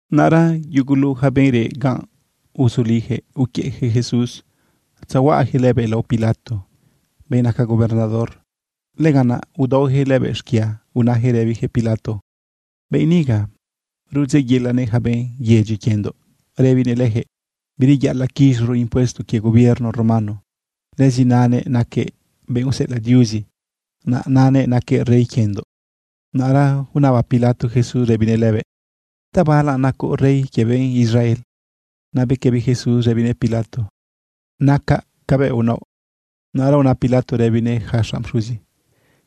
Naꞌra yugulu yaca benꞌ reꞌ ganꞌ, uzuliyaquëꞌ uquiëꞌyaquëꞌ Jesús tzahuaꞌayaquëꞌ lëbëꞌ lao Pilato, benꞌ naca gobernador. Lëganꞌ naꞌ udaoyaquëꞌ lëbëꞌ xquia, unayaquëꞌ rëbiyaquëꞌ Pilato: ―Benꞌ niga rudzeꞌyelanëꞌ yaca benꞌ yedyi quiendoꞌ rëbinëꞌ leyaquëꞌ bireyaꞌalaꞌ quiz̃oro impuesto quie gobierno romano. Lëzi nanëꞌ naquëꞌ benꞌ useꞌelaꞌ Diuzi, naꞌ nanëꞌ naquëꞌ rey quiendoꞌ. Naꞌra unaba Pilato Jesús rëbinëꞌ lëbëꞌ: ―¿Tabala nacoꞌ rey quie benꞌ Israel? Naꞌ bequëbi Jesús rëbinëꞌ Pilato: ―Nacaꞌ cabëꞌ unaoꞌ. Naꞌra una Pilato rëbinëꞌ yaca xanꞌ pxuzi,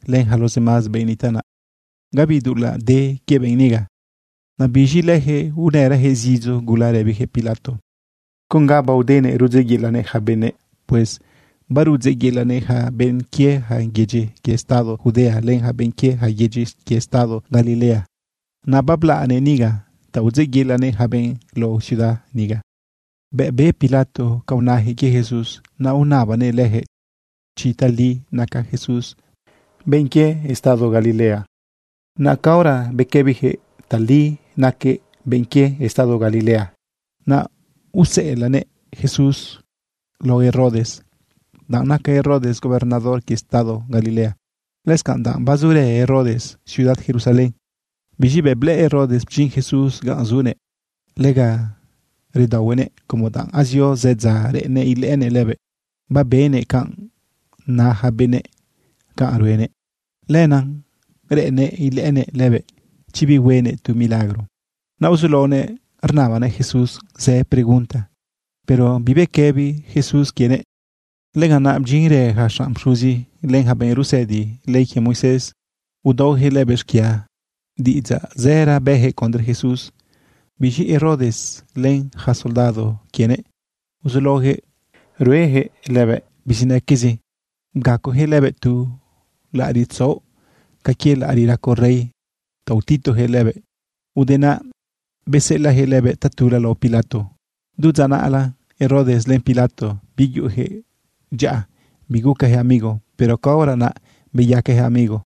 len yaca los demás benꞌ nitaꞌ naꞌ: ―Gabi dulaꞌ de quie benꞌ niga. Naꞌ biz̃i leyaquëꞌ unërayaquëꞌ zidzo gula rëbiyaquëꞌ Pilato: ―Con ga baodenëꞌ rudzeꞌyelanëꞌ yaca benëꞌ. Pues barudzeꞌyelanëꞌ yaca benꞌ quie yaca yedyi quie estado Judea len yaca benꞌ quie yaca yedyi quie estado Galilea. Naꞌ bablaꞌnëꞌ niga ta udzeꞌyelanëꞌ yaca benꞌ lao ciudad niga. Bëꞌ be Pilato canꞌ unayaquëꞌ quie Jesús, naꞌ unabanëꞌ leyaquëꞌ chi tali naca Jesús benꞌ quie estado Galilea. Naꞌ caora bequëbiyaquëꞌ tali naquëꞌ benꞌ quie estado Galilea, naꞌ useꞌelaꞌnëꞌ Jesús lao Herodes, danꞌ naca Herodes gobernador quie estado Galilea, lëscanꞌ danꞌ bazurë Herodes ciudad Jerusalén. Biz̃i bëꞌ blëꞌë Herodes bdyin Jesús ganꞌ zunëꞌ, lega redaohuenëꞌ como danꞌ azio zë dza reꞌennëꞌ ilëꞌënëꞌ lëbëꞌ. Babenëꞌ canꞌ na yaca benëꞌ canꞌ ruenëꞌ. Lenaꞌ reꞌennëꞌ ilëꞌënëꞌ lëbëꞌ chi bihuenëꞌ tu milagro. Naꞌ uzulaonëꞌ rnabanëꞌ Jesús zë pregunta, pero bibequëbi Jesús quienëꞌ. Lëganꞌ naꞌ bdyinrë yaca xanꞌ pxuzi, len yaca benꞌ rusëdi ley quie Moisés, udaoyaquëꞌ lëbëꞌ xquia. Diꞌidzaꞌ zëra bëyaquëꞌ condre Jesús. Biz̃i Herodes len yaca soldado quienëꞌ uzulaoyaquëꞌ rueyaquëꞌ lëbëꞌ bizinaquezi. Bgacoyaquëꞌ lëbëꞌ tu laꞌariꞌ tzaoꞌ ca quie laꞌariꞌ raco rey ta utituyaquëꞌ lëbëꞌ. Ude naꞌ beseꞌelaꞌyaquëꞌ lëbëꞌ tatula lao Pilato. Du dza naꞌla, Herodes len Pilato, biyuꞌuyaquëꞌ dyaꞌa bigucayaquëꞌ amigo, pero caora naꞌ beyacayaquëꞌ amigo.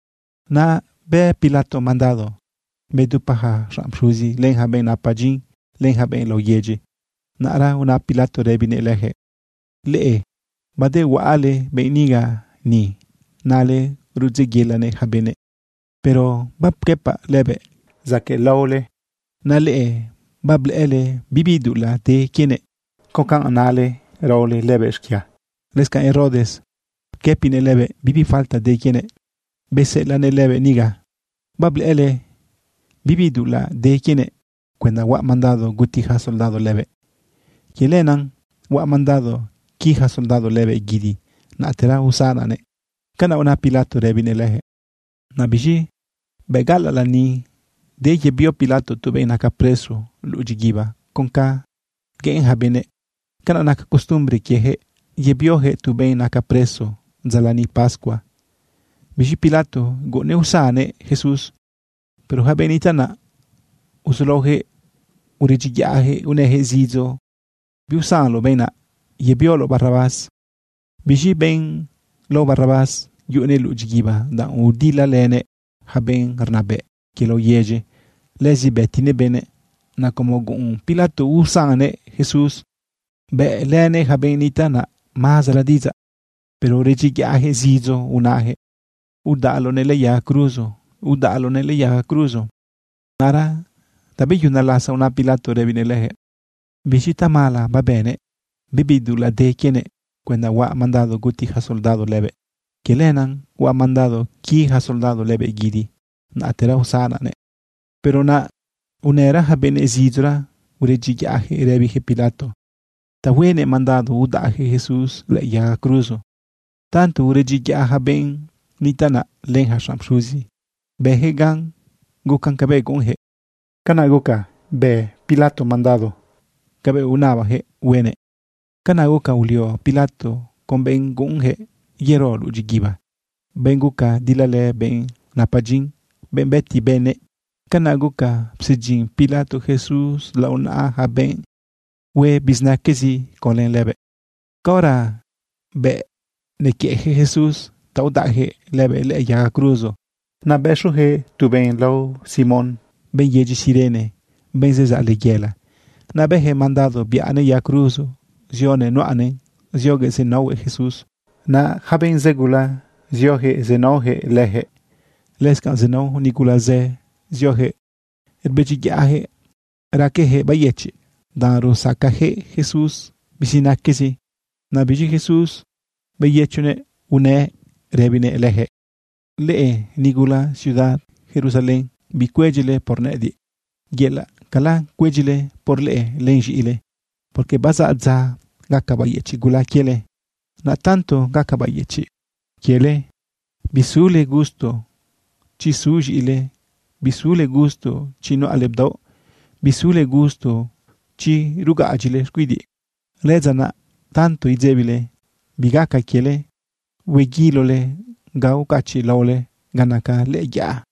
Naꞌ bë Pilato mandado bedupa yaca xanꞌ pxuzi, len yaca benꞌ napa dyin, len yaca benꞌ lao yedyi. Naꞌra una Pilato rëbinëꞌ leyaquëꞌ: ―Leꞌe badehuaꞌale benꞌ niga ni, nale rudzeꞌyelanëꞌ yaca benëꞌ, pero bapquëpaꞌ lëbëꞌ zaquëꞌ lao leꞌe, naꞌ leꞌe bablëꞌële bibi dulaꞌ de quienëꞌ con ca inale raole lëbëꞌ xquia. Lëscanꞌ Herodes pquëpinëꞌ lëbëꞌ bibi falta de quienëꞌ beseꞌelaꞌnëꞌ lëbëꞌ niga. Bablëꞌële bibi dulaꞌ de quienëꞌ cuenda huaꞌ mandado guti yaca soldado lëbëꞌ. Quie lenaꞌ huaꞌ mandado qui yaca soldado lëbëꞌ guidi, naꞌtera usanaꞌnëꞌ. ―Canaꞌ una Pilato rëbinëꞌ leyaquëꞌ. Naꞌ biz̃i bëꞌ gaꞌalaꞌ lani, de yebio Pilato tu benꞌ naca preso luꞌu dyiguiba con ca gueꞌen yaca benëꞌ. Canaꞌ naca costumbre quieyaquëꞌ yebioyaquëꞌ tu benꞌ naca preso dza lani pascua. Biz̃i Pilato guꞌunnëꞌ usannëꞌ Jesús. Pero yaca benꞌ nitaꞌ naꞌ uzulaoyaquëꞌ uredyiyaꞌyaquëꞌ unëyaquëꞌ zidzo: ―¡Biusanloꞌ benꞌ naꞌ! ¡Yebioloꞌ Barrabás! Biz̃i benꞌ lao Barrabás yuꞌunëꞌ luꞌu dyiguiba, danꞌ udilalënëꞌ yaca benꞌ rnabëꞌ quie lao yedyi, lëzi bëtinëꞌ benëꞌ. Naꞌ como guꞌun Pilato usannëꞌ Jesús, bëꞌlënëꞌ yaca benꞌ nitaꞌ naꞌ mazara diꞌidzaꞌ. Pero uredyiyaꞌyaquëꞌ zidzo unayaquëꞌ: ―¡Udaꞌloꞌnëꞌ lëꞌë yaga cruzo! ¡Udaꞌloꞌnëꞌ lëꞌë yaga cruzo! Naꞌra tabeyuna lasa una Pilato rëbinëꞌ leyaquëꞌ: ―¿Biz̃i tamala babënëꞌ? Bibi dulaꞌ de quienëꞌ cuenda huaꞌ mandado guti yaca soldado lëbëꞌ. Quie lenaꞌ huaꞌ mandado qui yaca soldado lëbëꞌ guidi, naꞌtera usanaꞌnëꞌ. Pero naꞌ unëra yaca benëꞌ zidzora uredyiyaꞌyaquëꞌ rëbiyaquëꞌ Pilato ta huenëꞌ mandado udaꞌyaquëꞌ Jesús lëꞌë yaga cruzo. Tanto uredyiyaꞌ yaca benꞌ nitaꞌ naꞌ len yaca xanꞌ pxuzi, bëyaquëꞌ gan gucan cabëꞌ guꞌunyaquëꞌ. Canaꞌ guca bë Pilato mandado cabëꞌ unabayaquëꞌ huenëꞌ. Canaꞌ guca ulio Pilato con benꞌ guꞌunyaquëꞌ yero luꞌu dyiguiba, benꞌ guca dilalë benꞌ napa dyin, benꞌ bëti benëꞌ. Canaꞌ guca psedyin Pilato Jesús lao naꞌa yaca benꞌ hue bizinaquezi conlë lëbëꞌ. Caora bëꞌ nequiëꞌyaquëꞌ Jesús ta udaꞌyaquëꞌ lëbëꞌ lëꞌë yaga cruzo, naꞌ bëxoyaquëꞌ tu benꞌ lao Simón, benꞌ yedyi Cirene, benꞌ zezaꞌ layela. Naꞌ bëyaquëꞌ mandado biꞌanëꞌ yaga cruzo zionëꞌ nuꞌanëꞌn zioguëꞌ zenaohuëꞌ Jesús. Naꞌ yaca benꞌ zë gula zioyaquëꞌ zenaoyaquëꞌ leyaquëꞌ. Lëscanꞌ zenao nigula zë zioyaquëꞌ rbedyiyaꞌyaquëꞌ raqueyaquëꞌ beyëchiꞌ, danꞌ rusacayaquëꞌ Jesús bizinaquezi. Naꞌ biz̃i Jesús beyëchiꞌnëꞌ unëꞌ rëbinëꞌ leyaquëꞌ: ―Leꞌe nigula ciudad Jerusalén, bicuedyile por nëꞌëdiꞌ. Yelaꞌcala cuedyile por leꞌe len z̃iꞌile. Porque bazaꞌ dza gaca bayëchiꞌ gula quiele. Naꞌ tanto gaca bayëchiꞌ quiele, bisule gusto chi zu z̃iꞌile, bisule gusto chi nuꞌale bdaoꞌ, bisule gusto chi rugaꞌadyile xcuidiꞌ. Lëdza naꞌ tanto idzebile bi gaca quiele, hueguilole ga ucachiꞌlaole ga naca lëꞌë yaꞌa.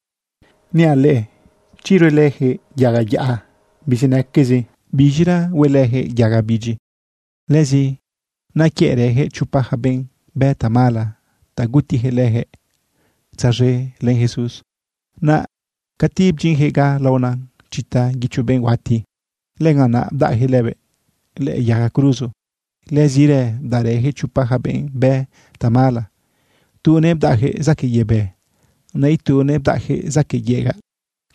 Niaꞌ leꞌe chi ruelëyaquëꞌ yaga yaꞌa bizinaquezi, ¿biz̃ira huelëyaquëꞌ yaga bidyi? Lëzi nequiëꞌrëyaquëꞌ chopa yaca benꞌ bë tamala ta gutiyaquëꞌ leyaquëꞌ tzaz̃e len Jesús. Naꞌ cati bdyinyaquëꞌ ga laona chita guicho benꞌ huati, lëganꞌ naꞌ bdaꞌyaquëꞌ lëbëꞌ lëꞌë yaga cruzo. Lëzirë bdaꞌrëyaquëꞌ chopa yaca benꞌ bë tamala. Tunëꞌ bdaꞌyaquëꞌ zaquëꞌ yebë, naꞌ itunëꞌ bdaꞌyaquëꞌ zaquëꞌ yegaꞌ.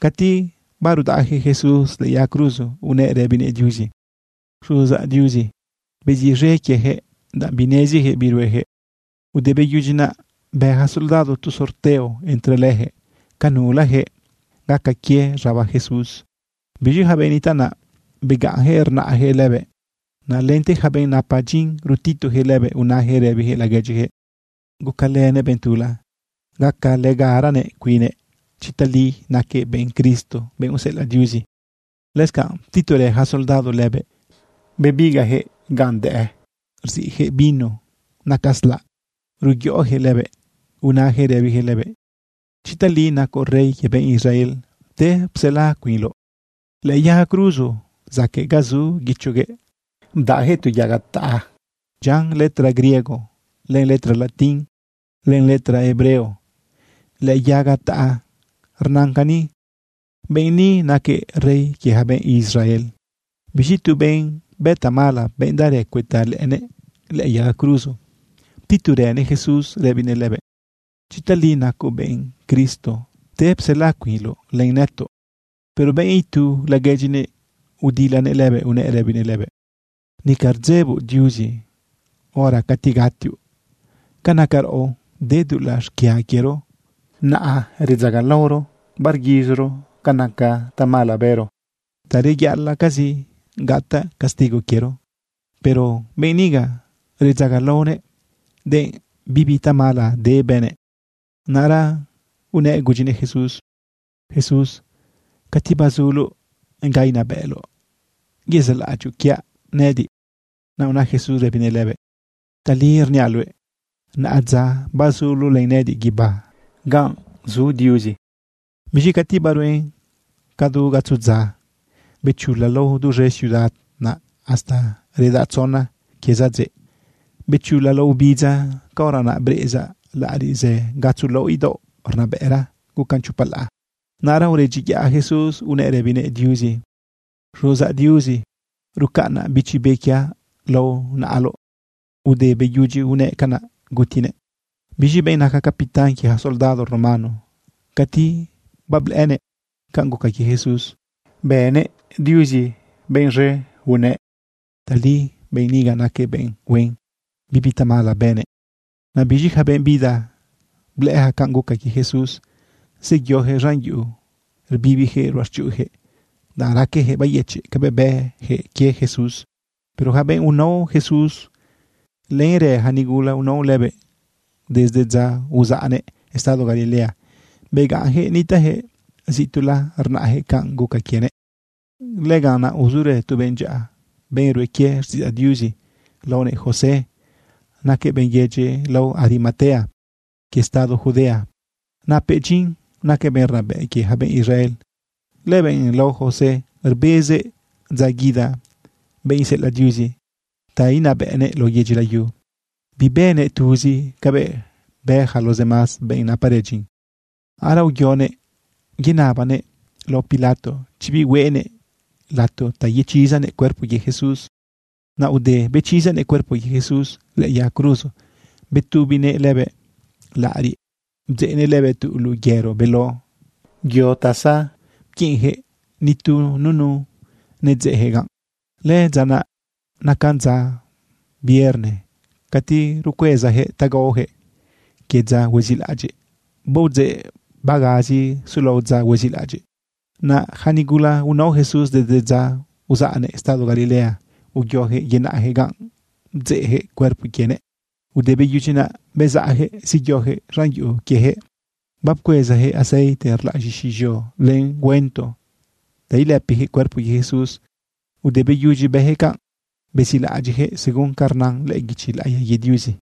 Cati barudaꞌyaquëꞌ Jesús lëꞌë yaga cruzo unëꞌ rëbinëꞌ Diuzi: ―Xuzaꞌ Diuzi, beziꞌz̃e quieyaquëꞌ, danꞌ bineziyaquëꞌ bi rueyaquëꞌ. Ude beyudyi naꞌ, bë yaca soldado tu sorteo entre leyaquëꞌ ca nulayaquëꞌ gaca quie z̃aba Jesús. Biz̃i yaca benꞌ nitaꞌ naꞌ, begaꞌnyaquëꞌ rnaꞌyaquëꞌ lëbëꞌ. Naꞌ lente yaca benꞌ napa dyin rutituyaquëꞌ lëbëꞌ unayaquëꞌ rëbiyaquëꞌ laguedyiyaquëꞌ: ―Gucalënëꞌ benꞌ tula, gacalëgaranëꞌ cuinnëꞌ chi tali naquëꞌ benꞌ Cristo, benꞌ useꞌelaꞌ Diuzi. Lëscanꞌ ptiturë yaca soldado lëbëꞌ. Bebigaꞌyaquëꞌ ganꞌ dëꞌë, rziꞌyaquëꞌ vino naca slaꞌ ruyoꞌoyaquëꞌ lëbëꞌ. Unayaquëꞌ rëbiyaquëꞌ lëbëꞌ: ―Chi tali nacoꞌ rey quie benꞌ Israel, pte psela cuinloꞌ. Lëꞌë yaga cruzo zaquëꞌ ga zu guichoguëꞌ, bdaꞌyaquëꞌ tu yaga taꞌa dyian letra griego, len letra latín, len letra hebreo. Lëꞌë yaga taꞌa rnan cani: “Benꞌ ni naquëꞌ rey quie yaca benꞌ Israel.” Biz̃i tu benꞌ bë tamala, benꞌ daꞌrë cuëta lëꞌënëꞌ lëꞌë yaga cruzo, ptiturënëꞌ Jesús rëbinëꞌ lëbëꞌ: ―Chi tali nacoꞌ benꞌ Cristo, pte psela cuinloꞌ len nëtoꞌ. Pero benꞌ itu laguedyinëꞌ udilanëꞌ lëbëꞌ unëꞌ rëbinëꞌ lëbëꞌ: ―¿Nica rdzeboꞌ Diuzi hora cati gatioꞌ? Ca naca raꞌo de dulaꞌ xquia quiero, naꞌa redzagalaoro barguiz̃oro ca naca tamala bëro. Ta reyaꞌalaꞌcazi gataꞌ castigo quiero, pero benꞌ niga redzagalaonëꞌ, denꞌ bibi tamala de bënëꞌ. Naꞌra unëꞌ gudyinëꞌ Jesús: ―Jesús, cati bazuloꞌ ganꞌ inabëꞌloꞌ, yezaꞌlaꞌadyoꞌ quiaꞌ nëꞌëdiꞌ. Naꞌ una Jesús rëbinëꞌ lëbëꞌ: ―Tali rniaꞌ luëꞌ, naꞌa dza bazuloꞌ len nëꞌëdiꞌ guibá ganꞌ zu Diuzi. Biz̃i cati baruen cadu gatzo dza, bechula lao duz̃e ciudad naꞌ hasta reda tzona quie sadzeꞌ. Bechula lao ubidza. Caora naꞌ breꞌeza laꞌariꞌ zë gatzo laoꞌ idaoꞌ rnabëꞌra gucan chopa laꞌa. Naꞌra uredyiyaꞌ Jesús unëꞌ rëbinëꞌ Diuzi: ―Xuzaꞌ Diuzi, rucaꞌnaꞌ bichi be quiaꞌ lao naꞌaloꞌ. Ude beyudyi unëꞌ canaꞌ, gutinëꞌ. Biz̃i benꞌ naca capitán quie yaca soldado romano, cati bablëꞌënëꞌ canꞌ guca quie Jesús, bënëꞌ Diuzi benꞌ z̃e unëꞌ: ―Tali benꞌ niga naquëꞌ benꞌ huen, bibi tamala bënëꞌ. Naꞌ biz̃i yaca benꞌ bida blëꞌë yaca canꞌ guca quie Jesús, zeyoyaquëꞌ z̃an yuꞌu rbibiyaquëꞌ ruꞌachuꞌuyaquëꞌ, danꞌ raqueyaquëꞌ beyëchiꞌ cabëꞌ bëyaquëꞌ quie Jesús. Pero yaca benꞌ unao Jesús, lenrë yaca nigula unao lëbëꞌ desde dza uzaꞌnëꞌ estado Galilea, begaꞌnyaquëꞌ nitaꞌyaquëꞌ zituꞌla rnaꞌyaquëꞌ canꞌ guca quienëꞌ. Lëganꞌ naꞌ uzurë tu benꞌ dyaꞌa, benꞌ rue quie xtiꞌidzaꞌ Diuzi laonëꞌ José. Naquëꞌ benꞌ yedyi lao Arimatea quie estado Judea. Napëꞌ dyin, naquëꞌ benꞌ rnabëꞌ quie yaca benꞌ Israel. Lëbenꞌ lao José rbezëꞌ dza guida benꞌ iseꞌelaꞌ Diuzi ta inabëꞌnëꞌ lao yedyi layu. Bibënëꞌ tuzi cabëꞌ bë yaca los demás benꞌ naparë dyin. Naꞌra uyonëꞌ yenabanëꞌ lao Pilato chi bihueꞌnëꞌ lato ta yechisanëꞌ cuerpo quie Jesús. Naꞌ ude bechisanëꞌ cuerpo quie Jesús lëꞌë yaga cruzo, betubinëꞌ lëbëꞌ laꞌariꞌ, bdzeꞌnëꞌ lëbëꞌ tu luꞌu yero beló yo ta zapquiꞌinyaquëꞌ, nitu nunu nedzeꞌyaquëꞌ ganꞌ. Lëdza naꞌ nacan dza vierna cati rucuezayaquëꞌ ta gaoyaquëꞌ quie dza huezilaꞌadyiꞌ. Baodzeꞌ bagazi sulao dza huezilaꞌadyiꞌ. Naꞌ yaca nigula unao Jesús desde dza uzaꞌnëꞌ estado Galilea, uyoyaquëꞌ yenaꞌyaquëꞌ ganꞌ bdzeꞌyaquëꞌ cuerpo quienëꞌ. Ude beyudyi naꞌ, bezaꞌyaquëꞌ zeyoyaquëꞌ z̃an yuꞌu quieyaquëꞌ bapcuezayaquëꞌ aceite rlaꞌ z̃ixi z̃eo len güento ta ilëpiyaquëꞌ cuerpo quie Jesús. Ude beyudyi bëyaquëꞌ canꞌ, bezilaꞌadyiꞌyaquëꞌ según ca rnan lëꞌë guichi laꞌiya quie Diuzi.